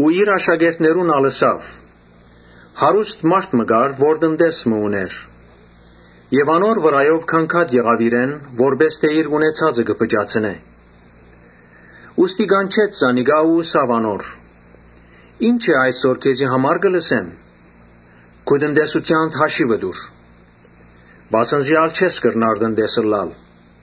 Իր աշակերտներուն ալ ըսաւ. «Հարուստ մարդ մը կար, որ տնտես մը ունէր։ Անոր վրայ գանգատ եղաւ իրեն՝ որպէս թէ իր ունեցածը կը փճացնէ։ Ուստի կանչեց զանիկա ու ըսաւ անոր. ‘Ի՞նչ է այս որ քեզի համար կը լսեմ։ Քու տնտեսութեանդ հաշիւը տուր, վասն զի ա՛լ չես կրնար տնտես ըլլալ’։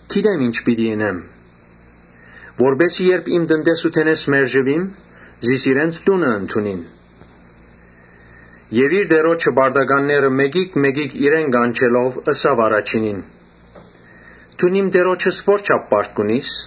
Գիտեմ ի՛նչ պիտի ընեմ, որպէս զի երբ իմ տնտեսութենէս հանուիմ, զիս իրենց տունը ընդունին։ Իր տիրոջը պարտականները մէկիկ մէկիկ իրեն կանչելով՝ ըսաւ առաջինին. ‘Դուն իմ տիրոջս ո՞րչափ պարտք ունիս’։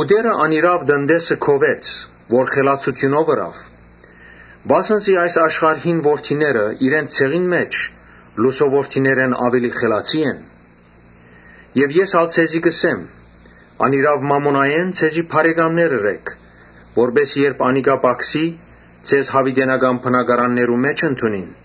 Տէրը անիրաւ տնտեսը գովեց, որ խելացութիւնով ըրաւ. վասն զի այս աշխարհին որդիները իրենց ցեղին մէջ՝ լուսոյ որդիներէն աւելի խելացի են»։ Ես ալ ձեզի կ’ըսեմ. «Անիրաւ մամոնայէն ձեզի բարեկամներ ըրէք, որպէս զի Այսինքն, ձեր կարօտութեան ժամանակըերբ անիկա պակսի՝ ՝ ձեզ յաւիտենական բնակարաններու մէջ ընդունին»։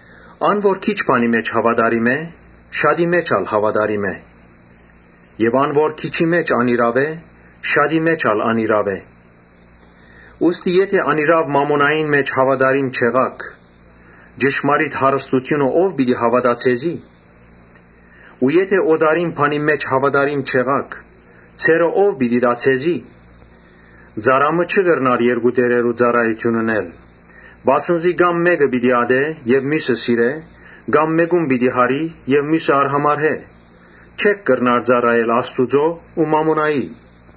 «Ան որ քիչ բանի մէջ հաւատարիմ է, շատի մէջ ալ հաւատարիմ կ’ըլլայ եւ ան որ քիչի մէջ անիրաւ է, շատի մէջ ալ անիրաւ կ’ըլլայ։ Ուստի եթէ անիրաւ մամոնային մէջ հաւատարիմ չըլլաք, ճշմարիտ հարստութիւնը ո՞վ պիտի հաւատայ ձեզի։ Եթէ օտարին բանին մէջ հաւատարիմ չըլլաք, ձերը ո՞վ պիտի տայ ձեզի։ Ծառայ մը չի կրնար երկու տէրերու ծառայութիւն ընել, վասն զի կա՛մ մէկը պիտի ատէ եւ միւսը սիրէ, կա՛մ Այսինքն, մէկը պիտի մեծարէմէկուն պիտի յարի՝ ՝ եւ միւսը արհամարհէ։ Չէք կրնար ծառայել Աստուծոյ ու մամոնային»։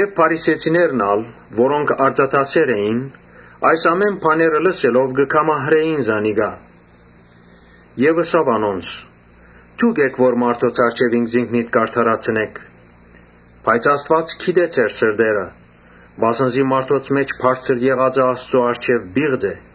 Փարիսեցիներն ալ, որոնք արծաթասէր էին, այս ամէնը լսելով կը քամահրէին զանիկա։ Յիսուս ըսաւ անոնց. «Դուք էք որ մարդոց առջեւ ինքզինքնիդ կ’արդարացնէք, բայց Աստուած գիտէ ձեր սրտերը. վասն զի մարդոց մէջ բարձր եղածը Աստուծոյ առջեւ պիղծ է։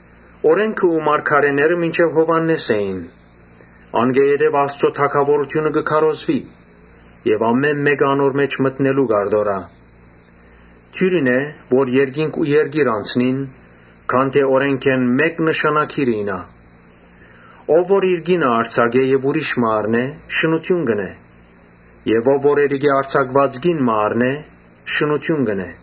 Օրէնքը ու մարգարէները մինչեւ Յովհաննէս էին. անկէ յետոյ Աստուծոյ թագաւորութիւնը կը քարոզուի եւ ամէն մէկը անոր մէջ մտնելու կ’արտորայ։ Աւելի դիւրին է, որ երկինք ու երկիր անցնին, քան թէ օրէնքէն մէկ նշանագիր իյնայ։ Ով որ իր կինը արձակէ եւ ուրիշ մը առնէ, շնութիւն կ’ընէ եւ ով որ էրիկէն արձակուած կին մը առնէ, շնութիւն կ’ընէ»։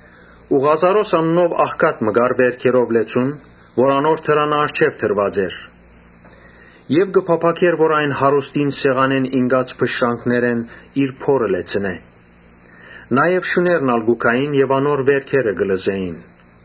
Ղազարոս անունով աղքատ մըն ալ կար վէրքերով լեցուն, որ անոր դրանը առջեւ դրուած էր։ Ան կը փափաքէր հարուստին սեղանէն ինկած փշրանքներէն իր փորը լեցնել։ Շուները կու գային եւ անոր վէրքերը կը լզէին։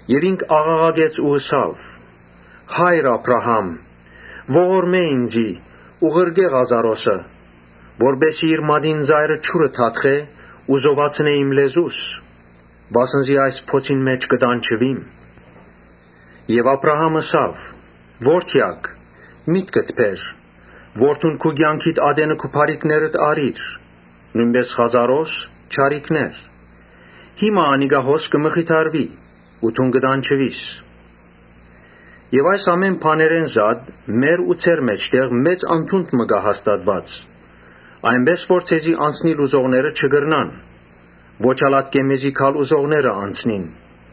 Այն ատեն աղաղակեց ու ըսաւ. ‘Հա՛յր Աբրահամ, ողորմէ ինծի ու ղրկէ Ղազարոսը, որպէս զի իր մատին ծայրը ջուրը թաթխէ ու զովացնէ իմ լեզուս, վասն զի այս բոցին մէջ կը տանջուիմ’։ Աբրահամ ըսաւ. ‘Ո՛րդեակ, միտքդ բեր, որ դուն քու կեանքիդ մէջ քու բարիքներդ առիր, նոյնպէս Ղազարոս՝ չարիքներ. հիմա անիկա [հոս] կը մխիթարուի ու դուն կը տանջուիս։ Այս ամէն բաներէն զատ՝ մեր ու ձեր մէջտեղ մեծ անդունդ մը կայ հաստատուած, որպէս զի ձեզի անցնիլ ուզողները չկրնան, ոչ ալ ատկէ մեզի գալ ուզողները՝ անցնին’։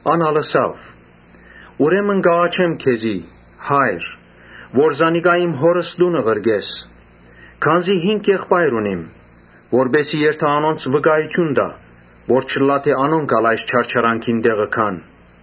Ան ալ ըսաւ. ‘Ուրեմն կ’աղաչեմ քեզի, հա՛յր, որ զանիկա իմ հօրս տունը ղրկես, Քանզի հինգ եղբայր ունիմ, որպէս զի երթայ անոնց վկայութիւն տայ, որ չըլլայ թէ անոնք ալ այս չարչարանքին տեղը գան’։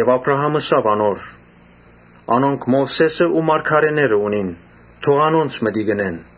Աբրահամ ըսաւ անոր. ‘Անոնք Մովսէսն ու մարգարէները ունին, թող անոնց մտիկ ընեն’։